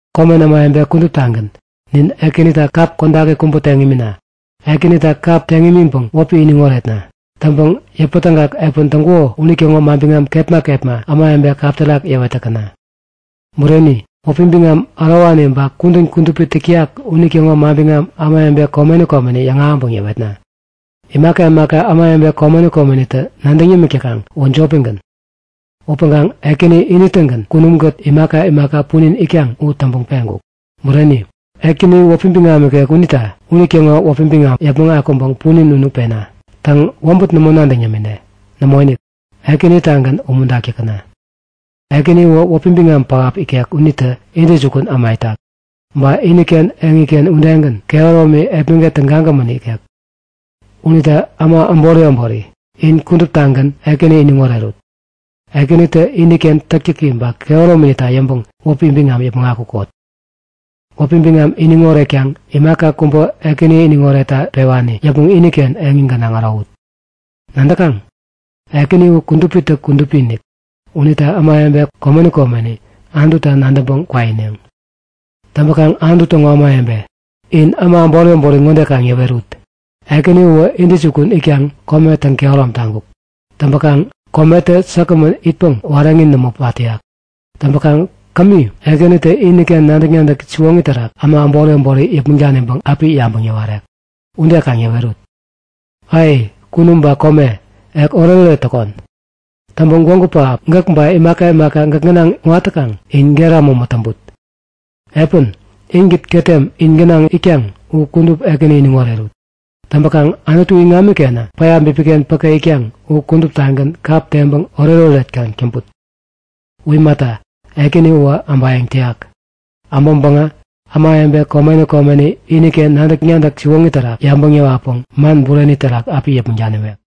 Komen ämawebe kuduptagän, nin Ekänita kap kodaki kubä teŋ imina! Ekänita kap teŋ imiŋpäŋ wäpi iniŋ oretna! Täŋpäŋ yäpätägak epän täŋkuko unitäŋo manbiŋam kepma kepma ämawebe kap terak yäwet täkäna! Bureni! Wäpi biŋam ärowani ba kudän kudupi täk täyak unitäŋo manbiŋam ämawebe komeni komeni yäŋahäŋpäŋ yäwetna! Imaka imaka ämawebe komeni komenitä nadäŋ yämik täkaŋ uwä jopigän. Upäŋkaŋ Ekäni ini-tägän kunumkät imaka imaka punin itkaŋ u täŋpäŋ peŋkuk. Bureni! Ekäni u wäpi biŋam ikek unita unitäŋo wäpi biŋamä yäpmäŋ akuŋpäŋ punin unu pena! Täŋ, wäbät nämo nadäŋ yämine. Nämoinik! Ekänitagän umuntak täkäna! Ekäni uwä wäpi biŋam pähap ikek unitä Intäjukun Äma itak. Ba iniken eŋini udegän, kehäromi, epmäget tägagämän ikek. Unita äma äbori äbori, in kuduptagän Ekäni iniŋ orerut! Ekänitä iniken täktäki ba kehärominita yäŋpäŋ wäpi biŋam yäpmäŋ akukot! Wäpi biŋam iniŋ oretkaŋ imaka kubä Ekäni iniŋ oretta pewani yäpmäŋ iniken eŋi gänaŋ ärowut! Nadäkaŋ? Ekäni u kudupitä kudupi-inik unita ämawebe komeni komeni Anututa nadäŋpäŋ kwaineŋ. Täŋpäkaŋ Anutu täŋo ämawebe, in äma äbori äbori ŋode kaŋ yäwerut; Ekäni uwä intäjukun itkaŋ kome täŋ-kehärom taŋkuk. Täŋpäkaŋ kometä säkgämän itpäŋ wareŋi nämo pat täyak. Täŋpäkaŋ kämi Ekänitä iniken nadäk-nadäk siwoŋi terak äma äbori äbori yäpmäŋ daniŋpäŋ api yabäŋ yäwarek. Ude kaŋ yäwerut! Ai! Kunum ba kome, ek oretoret täkon! Täŋpäŋ gwägu pähap, gäk ba imaka imaka gäk gänaŋ kuŋat täkaŋ in gera mämä täŋput! Epän, inkät ketem in gänaŋ itkaŋ u kudup Ekäni iniŋ orerut! Täŋpäkaŋ Anutu iŋamikenä päya bipiken päke itkaŋ u kuduptagän kap teŋpäŋ oretoret kaŋ täŋput! U imata, Ekäni uwä äbayäŋ täyak. Äbäŋpäŋä ämawebe komeni komeni iniken nadäk-nadäk siwoŋi terak yabäŋ yäwatpäŋ man bureni terak api yäpmäŋ daniwek.